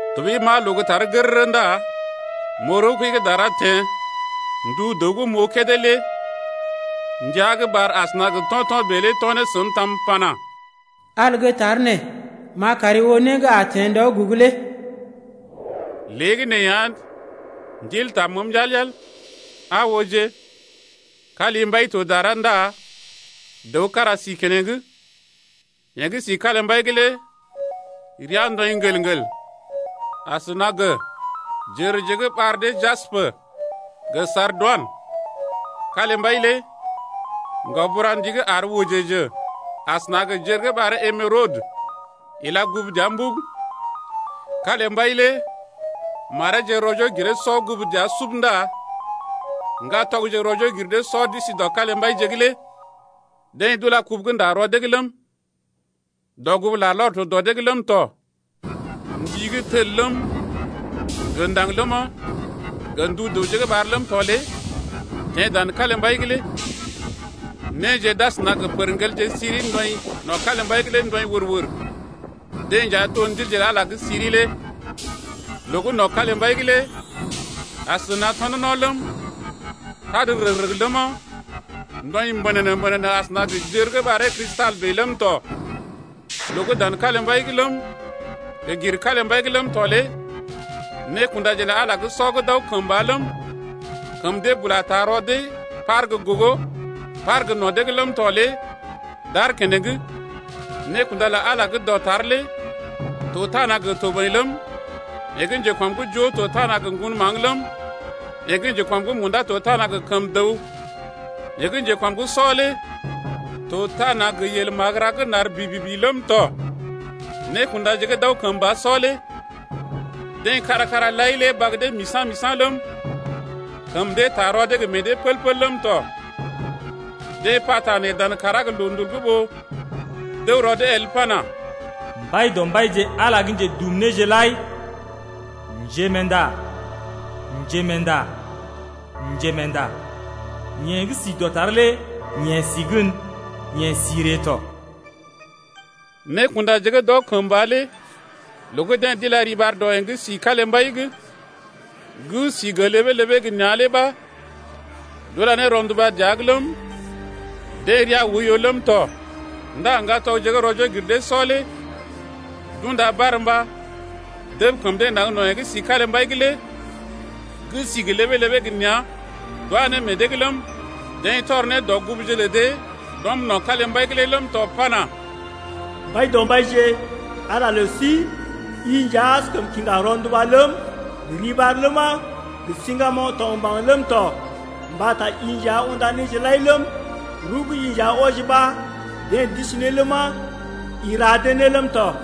Tɔɓəi m’aa loo gə́ tar gərərə ndá m’oo rəw-kəi gə́ dara teḛ. Ndu dəw gə́ m’oo kédé lé ndia gə́ ɓar asəna gə to̰to̰ bèe lé to̰ ne səm tam pana: Al gə́ tar nee m’a kari oo né gə́ a teḛ ndɔ gə́ a ree lé. Léegəneeya Ndil taa məəm yal-yal. Aa ooje, kalimbai to dara ndá dəw kára si keneŋ. Yeḛ gə́ si kalimbai’g lé rəa ndɔḭ ŋgəl-ŋgəl asəna gə jərje gə́ ɓar dee jaspə gə sardoinə. Kalimbai lé ŋgaoburandi gə́ àr wəjəjə asəna gə jər gə́ ɓaree emerodə ila gugu dəa sub. Kalimbai lé mareeje rɔ-joo-giree-sɔ gugu dəa sub ndá ŋgatɔgje rɔ-joo-giree-sɔ d’isi dɔ kalimbai’g lé. Deḛ d’ula kubu gə́ nda rɔ dee’g ləm, dɔgugu larlɔr to dɔ dee’g ləm tɔ. Ndi gə́ tel ləm, gə ndaŋg ləma, gə ndu dəwje gə́ ɓar ləm tɔ lé teḛ dan kalimbai’g lé. Néje d’asəna gə pərŋgelje siri ndɔḭ no̰ kalimbai’g lé ndɔḭ wər-wər, deḛ nja to ndilje lə Ala gə́ siri lé. Loo gə́ no̰ kalimbai’g lé asəna gə tɔnɔno̰ ləm, tad rəg-rəg ləma, ndɔḭ mbənənə-mbənənə asəna gə jər gə́ ɓaree Kristal bèe ləm tɔ. Loo gə́ dan kalimbai’g ləm, gə gir kalimbai’g ləm tɔ lé nékundaje lə Ala sɔ gə́ d’aw kəmba ləm, kəm dee bula taa rɔ dee par gə́ gogo gə par gə́ no̰ dee’g ləm tɔ lé d’aar keneŋ. Nékunda lə Ala gə́ dɔtar lé to tana gə toboḭ ləm, yeḛ gə́ njekɔm’g joo to tana gə ŋgon maŋg ləm, yeḛ gə́ njekɔm’g munda lé to tana gə kəm dəw, yeḛ gə́ njekɔm’g sɔ lé to tana gə yel magəra gə́ nar bibibi ləm tɔ. Nékundaje gə́ d’aw kəmba sɔ lé deḛ kára-kára lai lé bag dee misa̰-misa̰ ləm, kəm dee taa rɔ dee gə meḛ dee pəl-pəl ləm tɔ. Deḛ pata nee dan kàrá gə loondul’g ɓó d’əw rɔ dee el pana: Mbaidɔmbaije Ala gə́ Njedumnéje lai, Njerɔkunda, Njerɔkunda, Njerɔkunda, yeḛ gə́ si dɔtar lé yeḛ si gən, yeḛ si ree tɔ. Nékundaje gə́ d’aw kəmba lé loo gə́ deḛ d’ila riɓar dɔ yeḛ gə́ si kalimbai’g gə́ sí gə ləbee-ləbee gə nea̰ lé ɓa d’ula ne rɔnduba dəa’g ləm, deḛ rəa oiyo ləm tɔ Ndá ŋgatɔgje gə́ rɔ-joo-gir-dee-sɔ lé d’unda barmba dəb kəm dee naŋg no̰ yeḛ gə́ si kalimbai’g lé gə́ si gə ləbee-ləbee gə nea̰ d’wá ne meḛ dee’g ləm, deḛ tɔr ne dɔgugu lə dee d’ɔm no̰ kalimbai’g lé ləm tɔ pana: Mbaidɔmbaije, Ala lə sí, I nja askəm kiŋga rɔnduba ləm, gə riɓar ləma, Gə siŋgamoŋ gə tɔgmbaŋ ləm tɔ, Mbata i nja unda néje lai ləm, Rəw gə́ i nja wɔji ɓa deḛ d’isi ne ləma, I ra dee ne ləm tɔ.